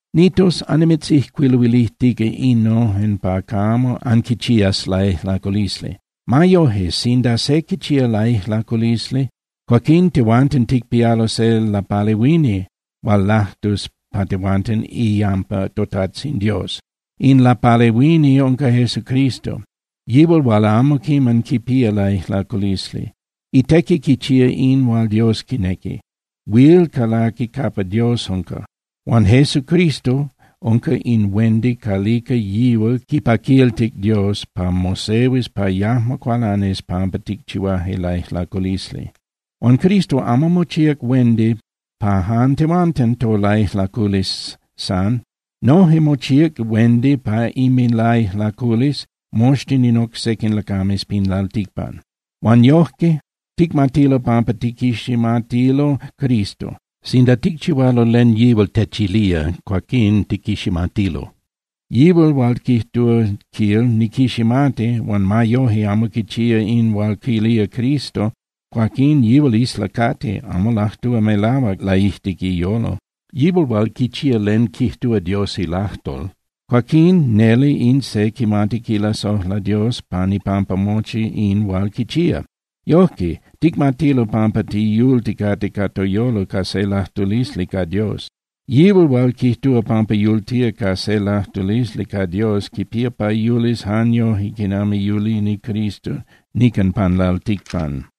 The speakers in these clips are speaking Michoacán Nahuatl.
Nitos, annimitzijcuiluilijtica innojen pa camo anquichías laijlaculisli. Ma yoje, sinda se quichía laijlaculisli, cuaquín tehuanten ticpialo se lapalehuini hual lajtus pa tehuanten iyampa toTajtzin Dios. In lapalehuini unca Jesucristo, yihual hual amo quiman quipía laijlaculisli. Itequi quichía in hual Dios quinequi, huil calaqui capa Dios unca. Huan Jesucristo unca in huendi calica yihual quipaquiltic Dios pa mosehuis pa yajmo cualanis pampa ticchihuaje laijlaculisli. Huan Cristo amo mochíac huendi pa jan tehuanten tolaijlaculisli san. Noje mochíac huendi pa inminlaijlaculisli moxtin in oc sequin lacames pin lalticpan. Huan yojque ticmatilo pampa tiquiximatilo Cristo: Sinda ticchihualo len yihual techilía, cuaquín tiquiximatilo. Yihual hual quijtúa, quil: “Niquiximati”, huan ma yoje amo quichía in hual quilía Cristo, cuaquín yihual islacati, amo lajtúa melahuac laijtic iyolo. Yihual hual quichía len quijtúa Dios ilajtol, cuaquinon neli in se quimati quilasojla Dios pan ipampa mochi in hual quichía. Yojque ticmatilo pampa tiyulticate ca toyolo ca se lajtulisli ca Dios. Yihual hual quijtúa pampa yultía ca se lajtulisli ca Dios quipía pa yulis jan yoje quinami yulini Cristo nican pan lalticpan.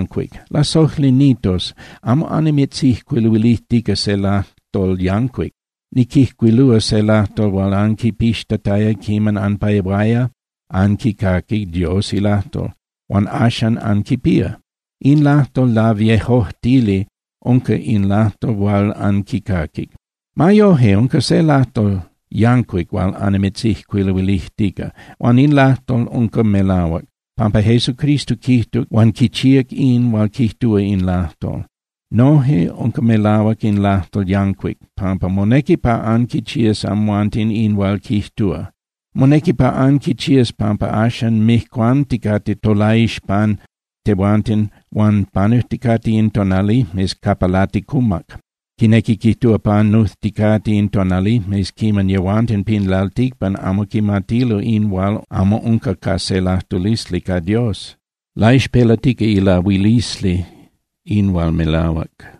Lasojli nitos, amo annimitzijcuiluilijtica se lajtol yancuic. Niquijcuilúa se lajtol hual anquipixtataya quiman anpehuaya anquicaqui Dios ilajtol huan axan anquipía. In lajtol laviejojtili unca in lajtol hual anquicaquic. Ma yoje, unca se lajtol yancuic hual annimitzijcuiluilijtica, huan in lajtol unca melahuac, pampa Jesucristo quijtuc huan quichíac in hual quijtúa in lajtol. Noje unca melahuac in lajtol yancuic, pampa monequi pa anquichías amhuanten in hual quijtúa. Monequi pa anquichías pampa axan mijcuanticate tolaixpan tehuanten huan panujticate in tonalijmes capa laticumac, quinequi quijtúa, panujticate in tonalijmes quiman yehuanten pin lalticpan amo quimatilo in hual amo unca ca se lajtulisli ca Dios. Laixpelatica ilahuilisli in hual melahuac,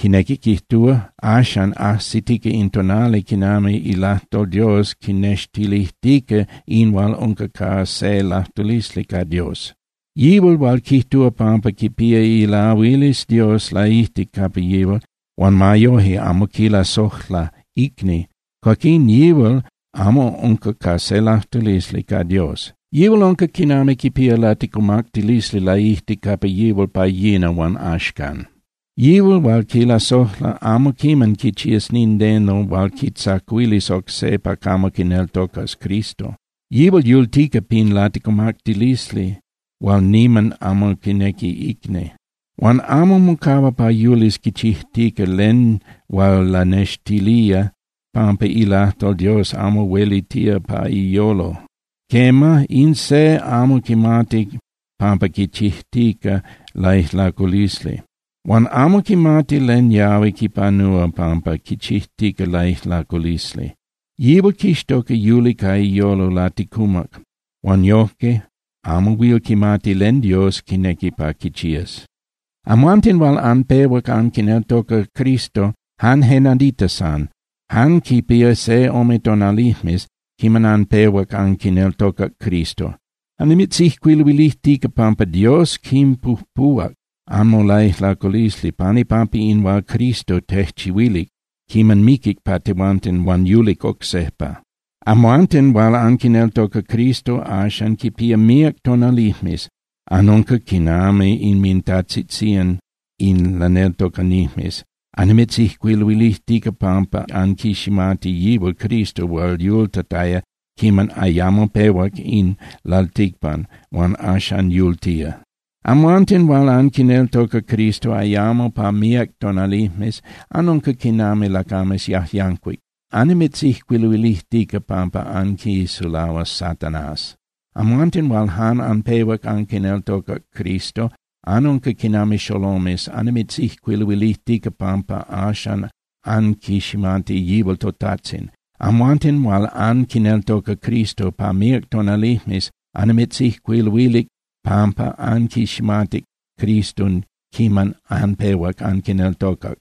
quinequi quijtúa, axan ajsitica in tonali quiman ilajtol Dios quinextilijtica in hual unca ca se lajtulisli ca Dios. Yihual hual quijtúa pampa quipía ilahuilisli Dios laijtic capa yihual, huan ma yoje amo quilasojla icni, cuaquín yihual amo unca ca se lajtulisli ca Dios. Yihual unca quinami quipía laticumactilisli laijtic capa yihual pa yina huan axcan. Yihual hual quilasojla amo quiman quichías nindeno hual quitzacuilis oc se pa camo quineltocas Cristo. Yihual yultica pin laticumactilisli hual niman amo quinequi icni. Huan amo mocahua pa yulis quichijtica len hual lanextilía pampa ilajtol Dios amo huelitía pa iyolo. Quema, in se amo quimati pampa quichijtica laijlaculisli, huan amo quimati len yahui quipanúa pampa quichijtica laijlaculisli. Yihual quixtoca yuli ca iyolo laticumac huan yojque amo huil quimati len Dios quinequi pa quichías. Amhuanten hual anpehuac anquineltoca Cristo jan je nadita san, jan quipía se ome tonalijmes quiman anpehuac anquineltocac Cristo, annimitzijcuiluilijtica, pampa Dios quinpujpuhuac anmolaijlaculisli pan ipampa in hual Cristo tejchihuilic quiman miquic pa tehuanten huan yulic oc sejpa. Amhuanten hual anquineltoca Cristo axan quipía míac tonalijmes, anunca quinami inmintajtzitzían in laneltocanijmes, annimitzijcuiluilijtica pampa anquiximati yihual Cristo hual yultataya quiman ayamo pehuac in lalticpan huan axan yultía. Amhuanten hual anquineltoca Cristo ayamo pa míac tonalijmes, anunca quinami lacames yajyancuic, annimitzijcuiluilijtica pampa anquisulahuac Satanás. Amhuanten hual jan anpehuac anquineltocac Cristo, anunca quinami xolomes, annimitzijcuiluilijtica pampa axan anquiximati yihual toTajtzin. Amhuanten hual anquineltoca Cristo pa míac tonalijmes annimitzijcuiluilic pampa anquiximatic Cristo quiman anpehuac anquineltocac.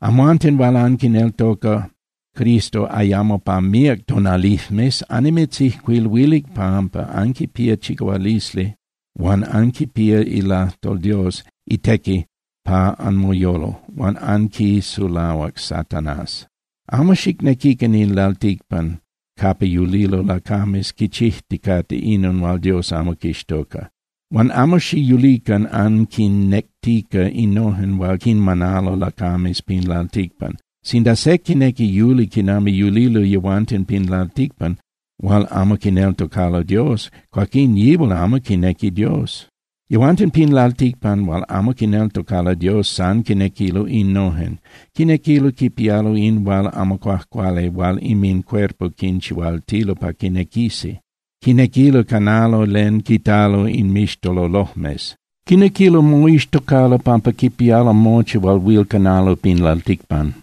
Amhuanten hual anquineltoca Cristo ayamo pa míac tonalijmes annimitzijcuiluilic pampa anquipía chicahualisli huan anquipía ilajtol Dios itequi pa anmoyolo, huan anquisulahuac Satanás. Amo xicnequican in lalticpan capa yulilo lacames quichijticate inon hual Dios amo quixtoca. Huan amo xiyulican anquinnectica innojen hual quinmanalo lacames pin lalticpan. Sinda se quinequi yuli quinami yulilo yehuanten pin lalticpan hual amo quineltocalo Dios, cuaquín yihual amo quinequi Dios. Yehuanten pin lalticpan hual amo quineltocalo Dios san quinequilo innojen: Quinequilo quipialo in hual amo cuajcuali hual inmincuerpo quinchihualtilo pa quinequisi. Quinequilo canalo len quitalo inmixtololojmes. Quinequilo moixtocalo pampa quipialo mochi hual huil canalo pin lalticpan.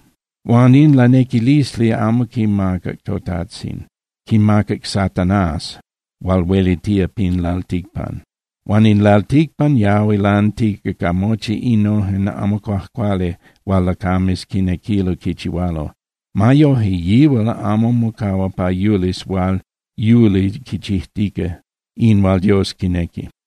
Huan in lanequilisli amo quinmacac toTajtzin. Quinmacac Satanás hual huelitía pin lalticpan. Huan in lalticpan yahui lantica ca mochi innojen amo cuajcuali hual lacames quinequilo quichihualo. Ma yoje, yihual amo mocahua pa yulis hual yuli quichijtica in hual Dios quinequi.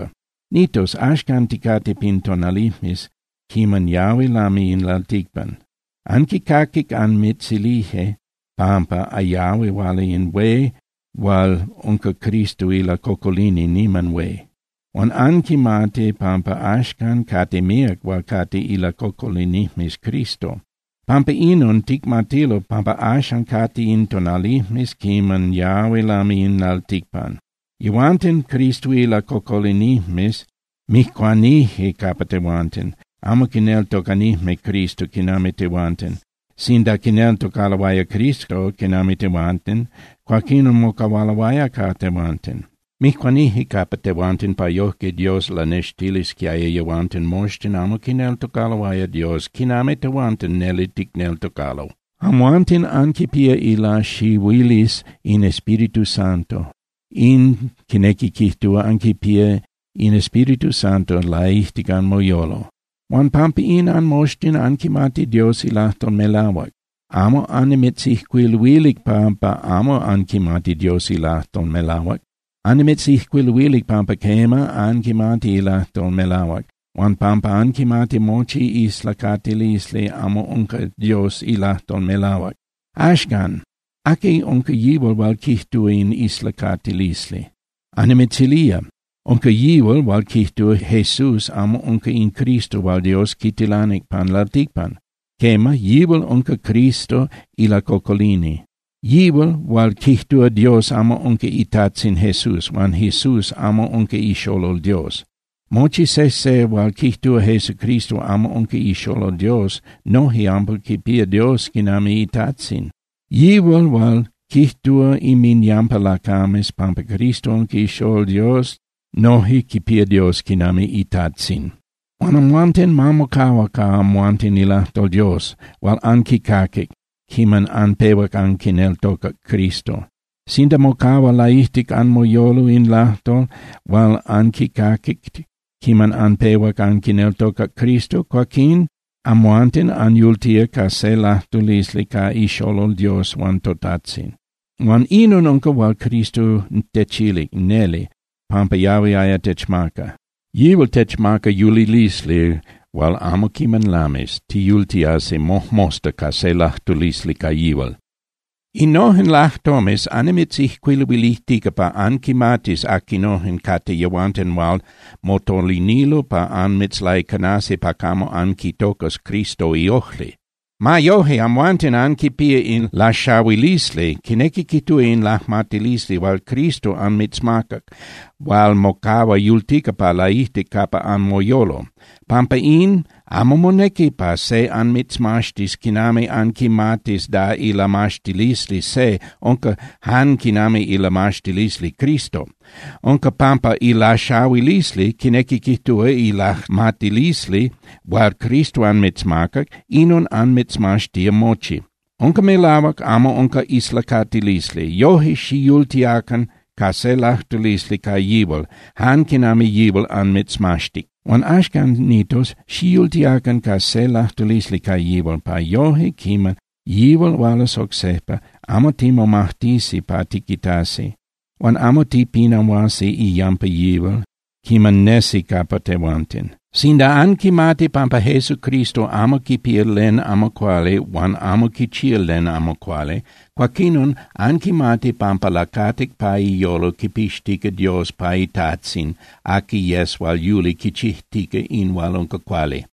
Nitos, axcan ticate pin tonalijmes quiman yahui lami in lalticpan. Anquicaquic anmitzilije pampa yahui huala in hué hual unca Cristo ilacocolini niman hué. Huan anquimati pampa axcan cate míac hual cate ilacocolinijmes Cristo. Pampa inon, ticmatilo pampa axan cate in tonalijmes quiman yahui lami in lalticpan. Yehuanten Cristo ilacocolinijmes mijcuanije capa tehuanten, amo quineltocanijme Cristo quinami tehuanten. Sinda quineltocaloaya Cristo quinami tehuanten, cuaquín mocahualoaya ca tehuanten. Mijcuanije capa tehuanten pa yojque Dios lanextilisquiaya yehuanten moxtin amo quineltocaloaya Dios quinami tehuanten neli ticneltocalo. Amhuanten anquipía ilaxahuilisli in Espíritu Santo. In quinequi quijtúa anquipía in Espíritu Santo laijtic anmoyolo, huan pampa in anmoxtin anquimati Dios ilajtol melahuac. Amo annimitzijcuiluilic pampa amo anquimati Dios ilajtol melahuac. Annimitzijcuiluilic pampa quema, anquimati ilajtol melahuac, huan pampa anquimati mochi islacatilisli amo unca Dios ilajtol melahuac. Axcan, ¿aqui unca yihual hual quijtúa in islacatilisli? Annimitzilía. Unca yihual hual quijtúa Jesús amo unca in Cristo hual Dios quitilanic pan lalticpan. Quema, yihual unca Cristo ilacocolini, yihual hual quijtúa Dios amo unca iTajtzin Jesús huan Jesús amo unca iXolol Dios. Mochi sejse hual quijtúa Jesucristo amo unca iXolol Dios noje amo quipía Dios quinami iTajtzin. Yihual hual quijtúa inminyampa lacames pampa Cristo unca iXolol Dios noje quipía Dios quinami iTajtzin. Huan amhuanten, ma mocahua ca amhuanten ilajtol Dios hual anquicaquic quiman anpehuac anquineltocac Cristo. Sinda mocahua laijtic anmoyolo in lajtol hual anquicaquic quiman anpehuac anquineltocac Cristo, cuaquín amhuanten anyultía ca se lajtulisli ca iXolol Dios huan toTajtzin. Huan inon unca hual Cristo techilic neli pampa yahuiaya techmaca. Yihual techmaca yulilisli hual amo quiman lamis, tiyultiasi mojmosta ca se lajtulisli ca yihual. Innojen lajtomes annimitzijcuiluilijtica pa anquimatis aquinojen cate yehuanten hual motolinilo pa anmitzlaicanasi pa camo anquitocas Cristo iojli. Ma yoje, amhuanten anquipía in laxahuilisli, quinequi quijtúa in lajmatilisli hual Cristo anmitzmacac hual mocahua yultica pa laijtic capa anmoyolo. Pampa in, amo monequi pa se anmitzmaxtis quinami anquimatis da ilamaxtilisli se unca jan quinami ilamaxtilisli Cristo. Unca pampa ilaxahuilisli, quinequi quijtúa, ilajmatilisli hual Cristo anmitzmacac, inon anmitzmaxtía mochi. Unca melahuac, amo unca islacatilisli. Yoje, xiyultiacan ca se lajtulisli ca yihual, jan quinami yihual anmitzmaxtic. Huan axcan, Nitos, xiyultiacan ca se lajtulisli ca yihual, pa yoje quiman yihual hualas oc sejpa, amo timomajtisi pa tiquitasi. Huan amo tipinahuasi iyampa yihual quiman nesi capa tehuanten. Sinda anquimati pampa Jesucristo amo quipía len amo cuali huan amo quichía len amo cuali, cuaquinon anquimati pampa lacatic pa iyolo quipixtica Dios pa iTajtzin aqui yes hual yuli quichijtica in hual unca cuali.